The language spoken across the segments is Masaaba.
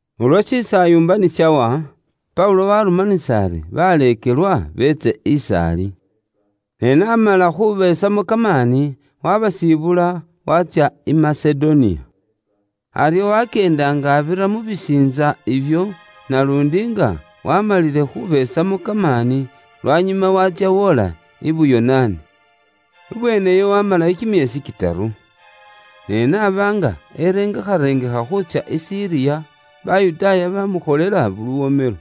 Ulwo shisaayumba ni shawa, Paulo waarumanisa ari baleekelwa beetse is'ali. Ne n'amala khubeesamo kamaani, waabasibula, waatsya i Masedoniya. Aryo wakyeenda nga abira mu bisiintsa ibyo naluundi nga waamalile khubeesamo kamaani, lwanyuma waatsya woola i Buyonaani. Ibweene iyo waamalayo kimyeesi kitaru. Ne n'aba nga erengekharengekha khuutsya i Siriya, Bayudaaya baamukholela luwomelo.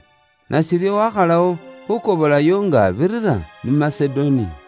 Nashiryo, waakhalawo khuukobolayo nga abirira mu Masedoniya.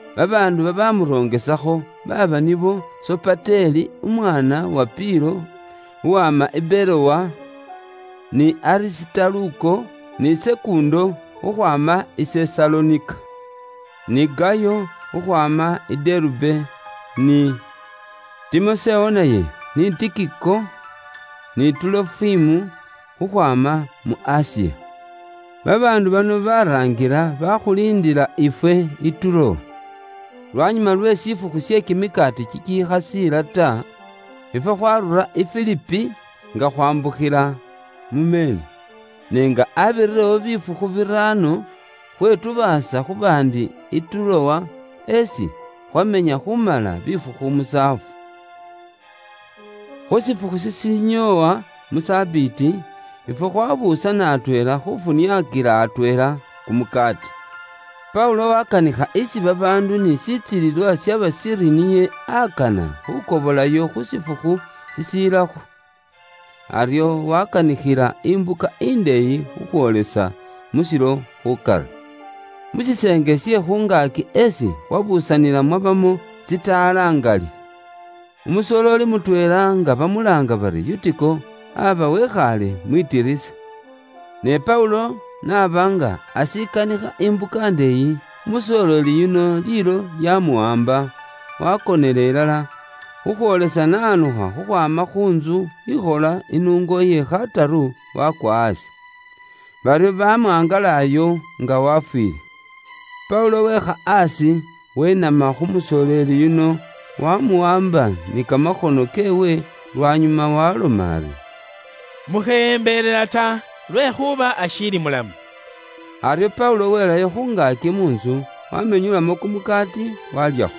Babaandu baabamurongesakho baaba nibo Sopateli umwaana wa Pilo, uwama i Berowa, ni Arisitaluko, ni Sekundo khukhwaama i Sesalonika, ni Gayo khukhwaama i Derube, ni Timosewo naye, ni Tikiko, ni Tuulofimu khukhwaama mu Asiya. Babaandu bano baraangila bakhuliindila ifwe i Turowa. Lwanyuma lwe shifukhu she kimikaati kikikhasiila ta, ifwe khwarura i Filipi nga khwambukhila mu meeri. Ne nga abirirewo bifukhu biraano, khwetubaasa khu baandi i Turowa, esi khwamenya khumala bifukhu musaafu. Khu shifukhu shishinyoowa mu Sabiiti, ifwe khwabuusana atweela khufuniakila atweela kumukaati. Paulo wakanikha isi babaandu ni shitsilililwa shaba shiri niye akana khukobolayo khu shifukhu shishilakho. Aryo wakanikhila imbuka indeeyi khukhwoolisa mu shilo khukari. Mu shiseenge she khu ngaaki esi khwabuusanila mwabamo tsitaala ngali. Umusooleli mutweela nga bamulaanga bari Yutiko, aba wekhaale mwitilisa. Ne Paulo n'aba nga ashikanikha imbuka indeeyi, umusoleeli yuno liilo lyamuwaamba, wakonela ilala, khukhwoolisa n'awanukha khukhwaama khu ntsu ikhola inungo iye khataru wakwa aasi. Baryo bamwangalayo nga wafwiile. Paulo weekha aasi, wenama khu musooleli yuno, wamuwaamba ni kamakhono keewe, lwanyuma waaloma ari, “Mukheyembelela ta, lwekhuuba ashiilimo bulamu.” Aryo Paulo welayo khu ngaaki mu ntsu, wamenyulamo kumukaati, walyakho.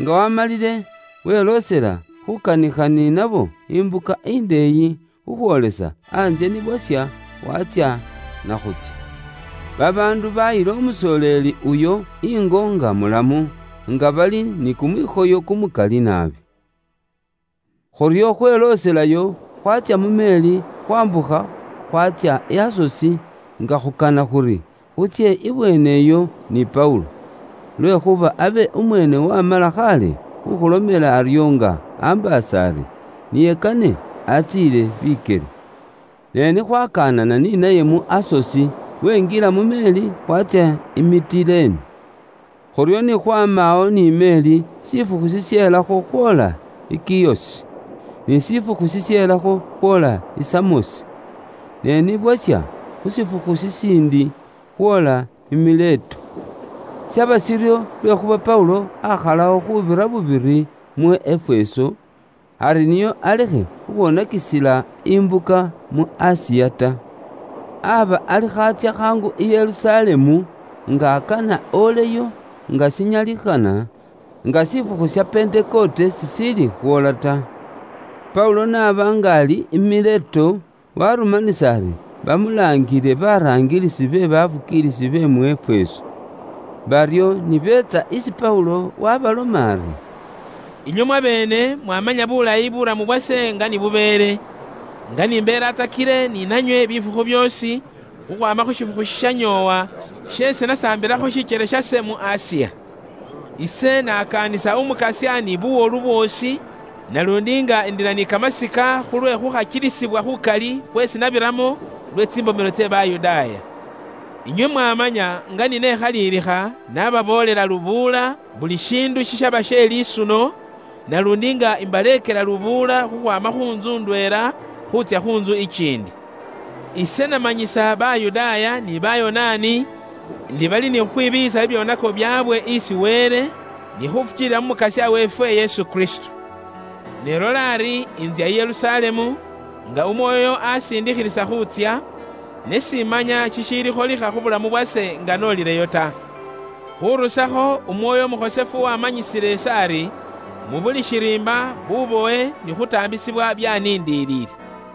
Nga waamalile weloosela khukanikha ni nabo imbuka indeeyi, khukhwoolisa antsye ni bwasha, watsya na khuutsya. Babaandu bayila umusoleeli uyo ingo nga mulamu, nga bali ni kumwikhoyo kumukali naabi. Khuryo khwelooselayo, khwatsya mu meeri, khwambukha khwatsya i Asosi, nga khukana khuri khutsye ibweene iyo ni Paulo. Lwekhuuba abe umweene wamala khaale khukhulomela aryo nga ambaasa ari niye kane atsiile bikyele. Ne ni khwakanana ni naye mu Asosi, wenjila mu meeri, khwatsya i Mitilene. Khuryo ni khwaama awo ni meeri, shifukhu shisheelakho khwoola i Kiyosi. Ni shifukhu shisheelakho khwoola i Samosi. Ne ni bwasha khu shifukhu shishiindi, khwoola i Mileto. Shaba shiryo lwekhuuba Paulo aakhalawo khuubira bubiri mu Efeso, ari nio alekhe khukhwoonakisila imbuka mu Asiya ta. Aba alikho atsya khaangu i Yerusalemu, nga akana oleyo, nga shinyalikhana, nga shifukhu sha Pentekote shishiili khwoola ta. Paulo n'aba nga ali i Mileto, warumanisa ari bamulaangile baraangilisi be bafukiilisi be mu Efeso. Baryo ni beetsa isi Paulo, waabaloma ari: “Inywe mwabeene mwaamanya bulayi bulamu bwase nga ni bubeele. Nga ni mbeelatsakile ni nanywe bifukhu byoosi khukhwaama khu shifukhu shishanyoowa sheesi nasambilakho shikyele shase mu Asiya. Ise naakaanisa Umukasya ni buwolu bwoosi naluundi nga indila ni kamasika khulwe khukhakiilisibwa khukali khweesi nabiramo lwe tsimbomelo tse Bayudaaya. Inywe mwamanya nga ni nekhalilikha nababoolela lubuula buli shiindu shishaba she lisuno, naluundi nga imbaleekela lubuula khukhwaama khu ntsu ndweela khuutsya khu ntsu ikiindi. Ise namanyisa Bayudaaya ni Bayonaani ndi bali ni khukhwibiiyisa bibyoonako byaabwe isi Wele ni khufukiilila mu Mukasya weefwe Yesu Kristo. “Ne lola ari ntsya i Yerusalemu, nga Umwoyo asiindikhilisa khuutsya, ne simanya shishiilikholikha khu bulamu bwase nga noolileyo ta. Khuurusakho Umwoyo Umukhosefu waamanyisile ise ari, mu buli shiriimba bubowe ni khuutaambisibwa byaaniindiliile.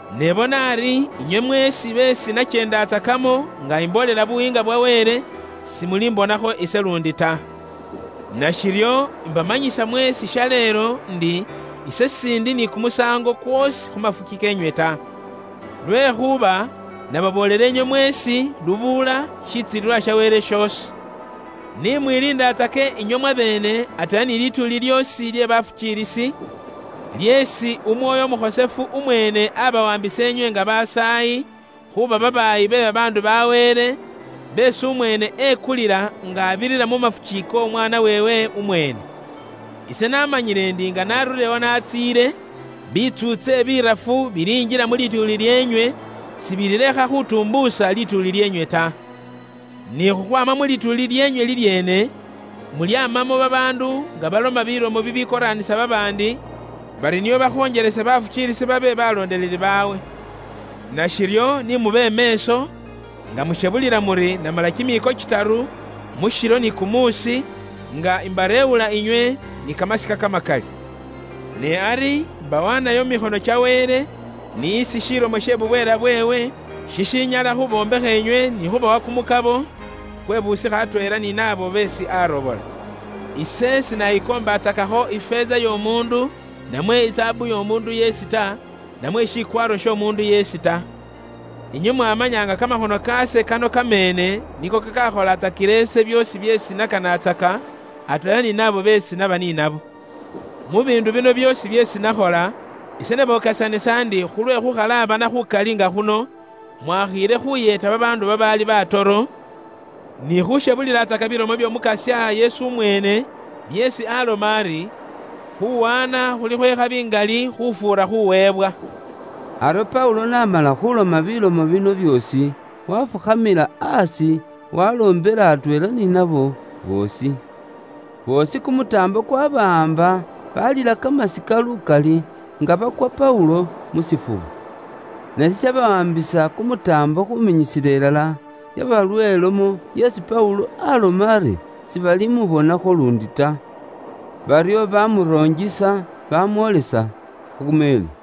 “Ne bona ari inywe mweesi beesi nakyeendatsakamo nga imboolela Buyiinga bwa Wele, simulimbonakho ise luundi ta. Nashiryo imbamanyisa mweesi shaleelo ndi ise s'indi ni kumusaango kwoosi khu mafuki keenywe ta. Lwekhuuba nababoolela inywe mweesi lubuula shitsilililwa sha Wele shoosi. Ni mwiliindatsake inywe mwabeene atweela ni lituuli lyoosi lye bafukiilisi, lyeesi Umwoyo Umukhosefu umweene abawaambisa inywe nga babaayi, khuuba babaayi be babaandu ba Wele beesi umweene ekulila nga abirira mu mafuki k'Omwaana weewe umweene. Ise namanyile ndi nga narulilewo naatsiile, bitsuutse birafu bilinjila mu lituuli lyeenywe; sibililekha khutuumbusa lituuli lyeenywe ta. Ni khukhwaama mu lituuli lyeenywe lilyeene, mulyamamo babaandu nga baloma bilomo bibikoraanisa babaandi, bari nio bakhonjelese bafukiilisi beekele baleekelwa baabwe. Nashiryo ni mube meeso, nga mushebulila muri namala kimiiko kitaru, mu shilo ni kumuusi, nga imbareewula inywe, ni kamasika kamakali. “Ne ari imbawaanayo mu mikhono kya Wele n'isi shilomo she bubweela bweewe, shishinyala khubombekha inywe ni khubawa kumukabo kwe busikha atweela ni naabo babaali bakhosefu beesi arobora. Ise sinayikoombatsakakho ifeeza y'omuundu, namwe izaabu y'omuundu yeesi ta, namwe shikwaaro sh'omuundu yeesi ta. Inywe mwamanya nga kamakhono kaase kano kameene niko kakakholatsakila ise byoosi byeesi nakanatsaka, atweela ni naabo beesi naba ni nabo. Mu biindu byoosi byeesi nakhola, ise nabokesanisa ndi khulwe khukhalaabana khukali nga khuno, mwakhiile khuyeeta babaandu babaali batoro, ni khushebulilatsaka bilomo by'Omukasya Yesu umweene, byeesi aloma ari, ‘Khuuwaana khuli khwe khabi ngali khufuura khuweebwa.’” Aryo Paulo n'amala khuuloma bilomo bino byoosi, wafukhamila aasi, waloombela atweela ni nabo boosi. Boosi kumutaambo kwabawaamba, balila kamasika lukali, nga bakwa Paulo mu shifuba. Ne shishabawaambisa kumutaambo khuminyisila ilala, yaba lwe lomo yeesi Paulo aloma ari sibalimubonakho luundi ta. Baryo bamuronjisa bamwoolisa khu meeri.